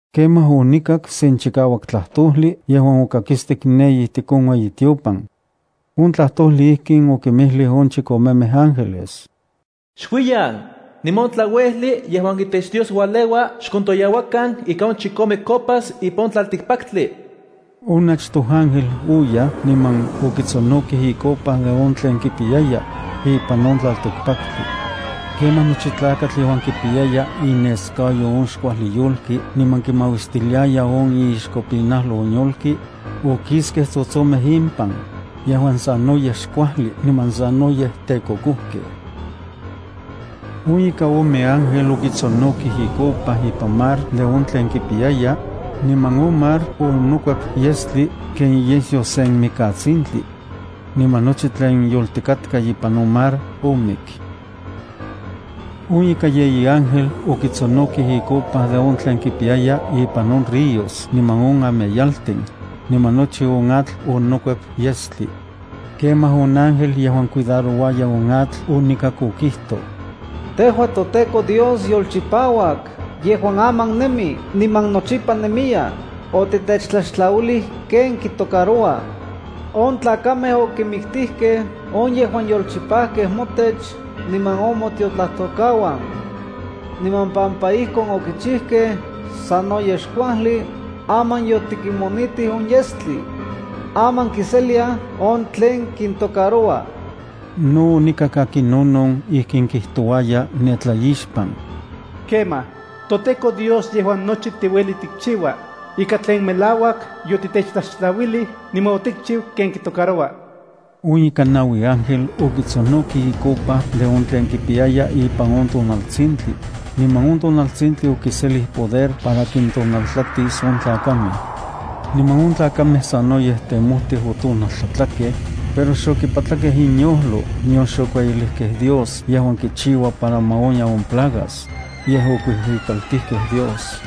Kemaj onikak sen chikauak tlajtojli yejuan okakistik ne ijtik on ueyitiopan. On tlajtojli ijkin okinmijlij on chikomemej ángeles: “Xuiyan, niman on tlauejli yejuan itech Dios ualeua xkontoyauakan ika on chikome copas ipan on tlaltikpaktli.” On achtoj ángel oyaj niman okitsonokij icopa de on tlen kipiyaya, ipan on tlaltikpaktli. Kemaj nochi tlakatl yejuan kipiyaya ineskayo on xkuajli yolki niman kimauistiliaya on iixkopinajlo on yolki okiskej tsotsomej impan yejuan sanoyej xkuajli niman sanoyej tekokojkej. On ika ome ángel okitsonokij icopa ipan mar de on tlen kipiyaya, niman on mar onokuep yestli ken iyesyo sen mikatsintli. Niman nochi tlen yoltikatka ipan on mar omik. On ika yeyi ángel okitsonokij icopa de on tlen kipiyaya ipan on ríos niman on ameyaltin, niman nochi on atl onokuep yestli. Kemaj on ángel yejuan cuidarouaya on atl onikak okijtoj: Tejua toTEKO Dios yolchipauak yejuan aman nemi niman nochipa nemiya, otitetlaxtlauilij ken kitocaroua. On tlakamej okinmiktijkej on yejuan yolchipajkej motech niman on motiotlajtokauan. Niman pampa ijkon okichijkej sanoyej xkuajli, aman yotikinmonitij on yestli. Aman kiseliaj on tlen kintocaroua. No onikak akinonon ijkin kijtouaya ne tlaixpan: “Kemaj, toTEKO Dios yejuan nochi tiueli tikchiua, ika tlen melauak yotitetlaxtlauilij niman otikchiu ken kitocaroua.” On ika naui ángel okitsonokij icopa de on tlen kipiyaya ipan on tonaltsintli, niman on tonaltsintli okiselij poder para kintonaltlatis on tlakamej. Niman on tlakamej sanoyej temojtij otonaltlatlakej, pero xokipatlakej inyojlo nion xokueyilijkej Dios yejuan kichiua para ma onya on plagas, yej okuijuikaltijkej Dios.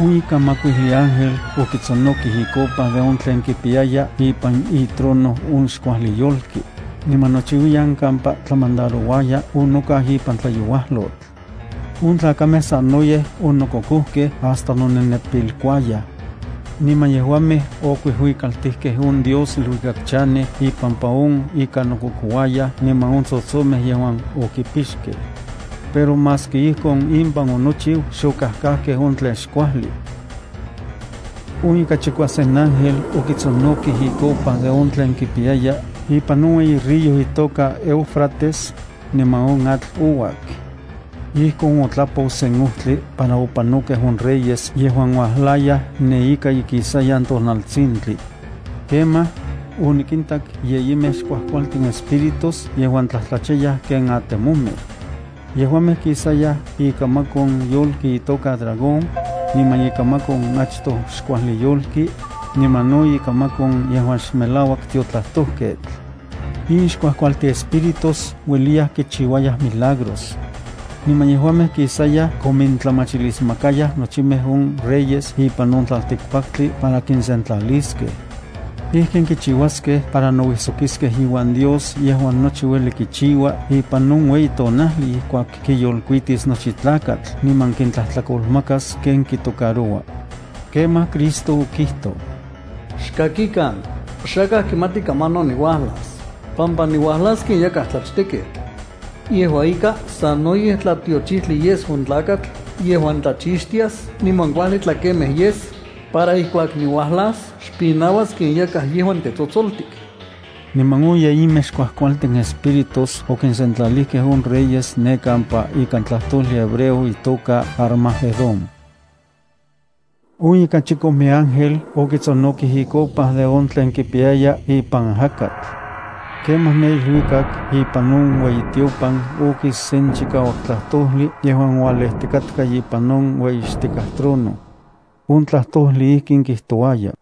On ika makuijli ángel okitsonokij icopa de on tlen kipiyaya ipan itrono on xkuajli yolki, niman nochiuiyan kampa tlamandarouaya onokau ipan tlayouajlotl. On tlakamej sanoyej onokokojkej hasta nonenepilkuayaj. Niman yejuamej okuijuikaltijkej on Dios iluikak chanej ipampa on ika nokokouayaj niman on tsotsomej yejuan okipixkej. Pero maski ijkon impan onochiu, xokajkajkej on tlen xkuajli. On ika chikuasen ángel okitsonokij icopa de on tlen kipiyaya ipan on ueyi río itoka Éufrates, niman on atl ouak. Ijkon otlapou sen ojtli para opanokej on reyes yejuan uajlayaj ne ika ikisayan tonaltsintli. Kemaj, onikintak yeyimej xkuajkualtin espíritus yejuan tlajtlachayaj ken atemomej. Yejuamej kisayaj ikamak on yolki itoka dragón, niman ikamak on achtoj xkuajli yolki, niman no ikamak on yejuan xmelauak tiotlajtojketl. In xkuajkualtin espíritus ueliyaj kinchiuaj milagros. Niman yejuamej kisayaj komintlamachilismakayaj nochimej on reyes ipan on tlaltikpaktli para kinsentlaliskej. Ijkin kichiuaskej para nouijsokiskej iuan Dios yejuan nochi ueli kichiua ipan on iueyitonajli ijkuak kiyolkuitis nochi tlakatl niman kintlajtlakolmakas ken kitocaroua. Kemaj Cristo okijtoj: “Xkakikan, xakaj kimati kamanon niuajlas pampa niuajlas ken yakaj tlachtekketl. Yejua ika, sanoyej tlatiochijtli yes on tlakatl yejuan tlachixtias niman kuajli tlakemej yes, para ijkuak niuajlas xpinauas ken yakaj yejuan tetsotsoltik.” Niman on yeyimej xkuajkualtin espíritus okinsentlalijkej on reyes ne kampa ikan tlajtojli hebreo itoka Armagedón. On ika chikome ángel okitsonokij icopa de on tlen kipiyaya ipan ajakatl. Kemaj ne iluikak ipan on ueyitiopan okis sen chikauak tlajtojli yejuan ualejtikatka ipan on ueyixtikaj trono. On tlajtojli ijkin kijtouaya: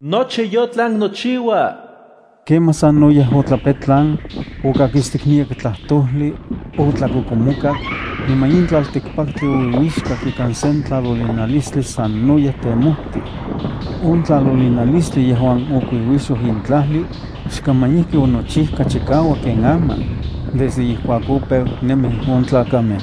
“Nochi yonochiu.” Kemaj sanoyej otlapetlan, otlakakistik chikauak, otlakokomokak, niman in tlaltikpaktli ouiuixkak ikan sen tlalolinalistli sanoyej temojtij. On tlalolinalistli yejuan okuiuixoj in tlajli, xkaman ijki onochijka chikauak ken aman, desde ijkuak opeu nemij on tlakamej.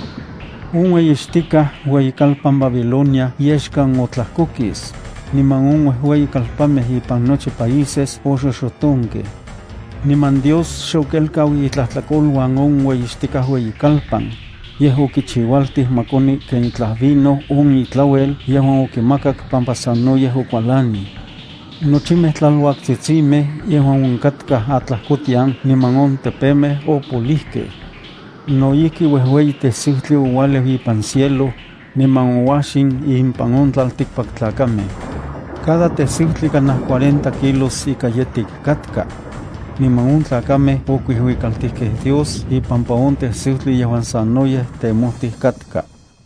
On ueyixtikaj ueyikalpan Babilonia yexkan otlajkokis, niman on uejueyi kalpanmej ipan nochi países oxoxotonkej. Niman Dios xokelkau itlajtlakoluan on ueyixtikaj ueyikalpan, yej okichiualtij ma koni ken itlaj vino on itlauel yejuan okimakak pampa sanoyej okualanij. Nochimej tlaluaktsitsimej yejuan onkatkaj atlajkotian niman on tepemej opolijkej. No ijki uejueyi tesiutli oualeu ipan cielo, niman ouajxin impan on tlaltikpaktlakamej. Cada tesiutli kanaj cuarenta kilos ika yetik katka. Niman on tlakamej okuijuikaltijkej Dios ipampa on tesiutli yejuan sanoyej temojtij katka.